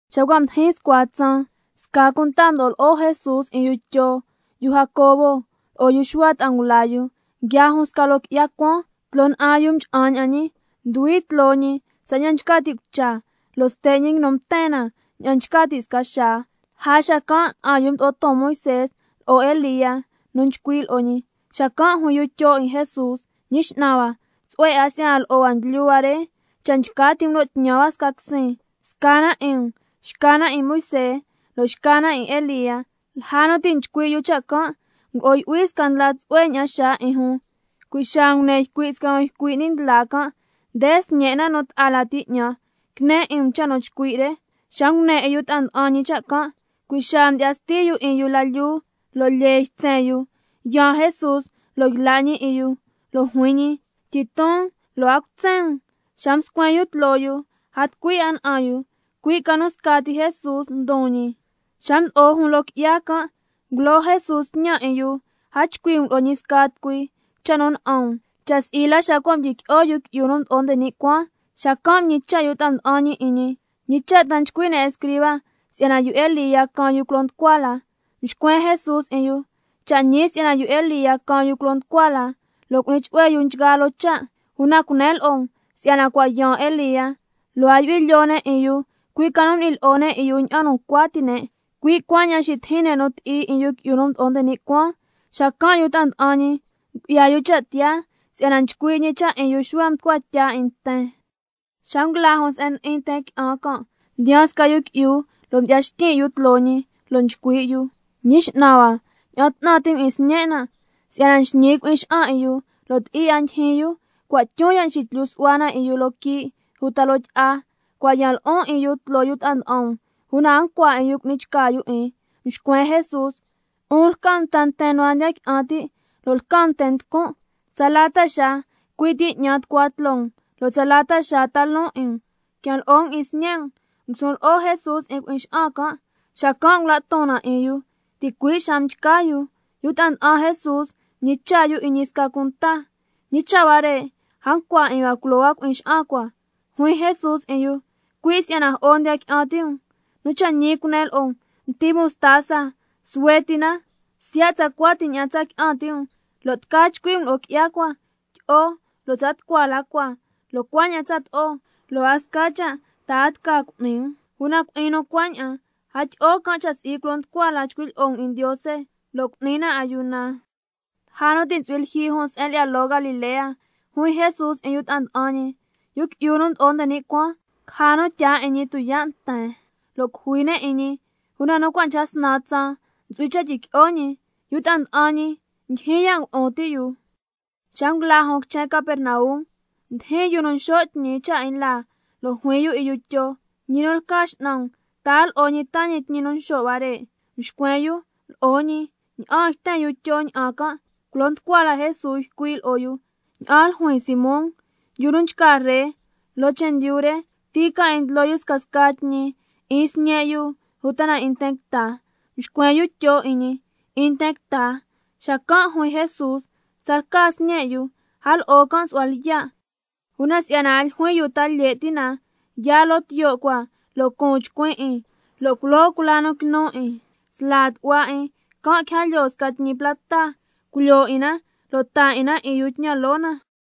Xa cua' mdijin scua tsaan, sca cunta mdo'o lo'o Jesús 'in yu Tyo, yu Jacobo, lo'o yu Xuhua ta'a ngula yu, nguiaa jun sca loo qui'ya cuaan. Tloo na'an yu mcha'an ña'an ñi, nduhui tloo ñi tsaña'an nchca ti' cucha, lo' ste' ñi nguinu mten na tsaña'an nchca ti' sca xaa. Lja xacan' na'an yu mdo'o ton Moisé lo'o Elía nu nchcui' lo'o ñi. Xacan' juin yu Tyo 'in Jesús: Ñi X'nan hua, tsu'hue 'a si'yana lo'o hua ndlyu hua re. Cha' nchca ti' um lo' tñan hua snan quisin, sca na 'in um, xca na 'in Moisé, lo' xca na 'in Elía. Lja nu ti' nchcui' yu cha' can', nguo'o yu'hui sca ndla tsu'hue ña'an xaa 'in jun, cui' xaa ngune ycui' sca nu ycui' ni' ndla can': Nde Sñen' nan' nu ta'a lati 'ñan, quine 'in um cha' nu chcui' re. Xa ngune 'in yu ta'a nda'an ñi cha' can', cui' xaa mdyi'ya sti yu 'in yu la lyuu lo' lyee ytsen yu. Yaan Jesús lo' yla' ñi 'in yu, lo' juin ñi: Tyiton lo' a cutsen um. Xa mscuen yu tloo yu, a tucui 'a na'an yu, cui' ca nu xca ti Jesús ndon ñi. Xa mdo'o jun loo qui'ya can', ngulo Jesús tñan 'in yu: A chcui' um lo'o ñi sca tucui cha' nu na'an um, cha' si'i la xa cua' mdyiqui'o Yu Qui'yu nu Mdo'o nde ni' Cuaan. Xacan' mñicha' yu ta'a nda'an ñi 'in ñi: ¿Ñi cha' ta nchcui' ne' escriba si'yana yu Elía caan yu culo nducua la? Mxcuen Jesús 'in yu: Cha' ñi si'yana yu Elía caan yu culo nducua la, lo' cu'ni chu'hue yu nchgaa loo cha'. Una cunen lo'o um si'yana cua' yaan Elía, lo' a yu'hui lyoo ne' 'in yu, cui' ca nu m'ni lyi'o ne' 'in yu ña'an nu ncua ti' ne', cui' cuaña'an xitijin ne' nu ti'i 'in Yu Qui'yu nu Mdo'o nde ni' Cuaan. Xacan' yu ta'a nda'an ñi ngu'ya yu cha' tiyaa si'yana nchcui' ñi cha' 'in yu Xuhua mducua tya 'in nten. Xa nguila jun se'en ndi'in nten qui'an can', mdiyaan sca yu qui'yu lo' mdyi'ya xtyin' yu tloo ñi, lo' nchcui' yu: Ñi X'nan hua, ña'an 'tnan ti' um 'in sñen' nan', si'yana nxñi cui'in 'in yu lo' ti'i 'a ndijin yu, cua' tyun ya' nxitlyu su'hua na 'in yu loo quii' uta loo tyi'a. Cua' yan lo'on 'in yu tloo yu ta'a nda'an um, una a ncua 'in yu cu'ni chca yu 'in. Mxcuen Jesús: ¡'Un lca um nten nu a ndiya qui'an ti' lo' lca um nten nducun'! ¿Tsala ta xaa cui' ti 'ñan nducua tloo um, lo' tsala xaa ti' ta loon 'in um? Quian lo'o um 'in sñe' um. Ngusun lo'o Jesús 'in cui'in xa'an can', xacan' ngula' ton na 'in yu, ticui' xaa mchca yu. Yu ta'a nda'an Jesús mñicha' yu 'in ñi sca cunta: ¿Ñi cha' huare', a ncua 'in hua culo hua cui'in xa'an cua? Juin Jesús 'in yu: Cui' si'yana jo'o ndiya qui'an ti' um. Nu cha' ñi cunen lo'o um, mti mostaza suhue ti na, siya' tsacua ti ña'an tsa qui'an ti' um, lo' tca chcui' um lo'o qui'ya cua: Tyi'o lo' tsa tucua la cua, lo' cuaña'an tsato'o, lo' a sca cha' ta a tca cu'ni um. Una cui'in nu cuaña'an, a tyi'o can' cha' si'i culo nducua la chcui' lyi'o na 'in Ndiose lo' cu'ni na ayuna. Lja nu ti' ntsu'hui lyijyi jun se'en lyi'ya loo Galilea, juin Jesús 'in yu ta'a nda'an ñi: Yu Qui'yu nu Mdo'o nde ni' Cuaan caja nu tyaa 'in ñi tuyaa' nten, lo' cujui ne' 'in ñi, una nu cua' ca snan tsaan ntsu'hui cha' tyiqui'o ñi. Una yu ta'a nda'an ñi ndyijyin ya' ngulu'un ti' yu. Xa nguila jun quichen Capernaum, mdijin yu nu nxo' tñi cha' 'in laa, lo' juin yu 'in yu Tyo: Ñi nu lca X'nan um, ¿ta a lo'o ñi taa ñi tñi nu nxo' hua re? Mxcuen yu: Lo'o ñi. Ña'aan yten yu Tyo ña'an can' culo nducua la Jesús ycui' lo'o yu: ¿Ña'an ljuin, Simón? Yu nu nchca ree loo chendyu re, ¿ti ca 'in ndlo yu scasca tñi, 'in sñe' yu uta na 'in nten quita? Mxcuen yu Tyo 'in ñi: 'In nten quita. Xacan' juin Jesús: Tsalca sñe' yu, a lo'o can' su'hua lyiya'. Una si'yana a ljuin yu ta lye' ti' na, yaa loo tiyo' cua lo' cuun chcuin 'in, lo' culoo cula nu quinu 'in sla tu'hua 'in, can' quija lyoo sca tñi plata, culyoo 'in na lo' taa 'in na 'in yu tñan loo na.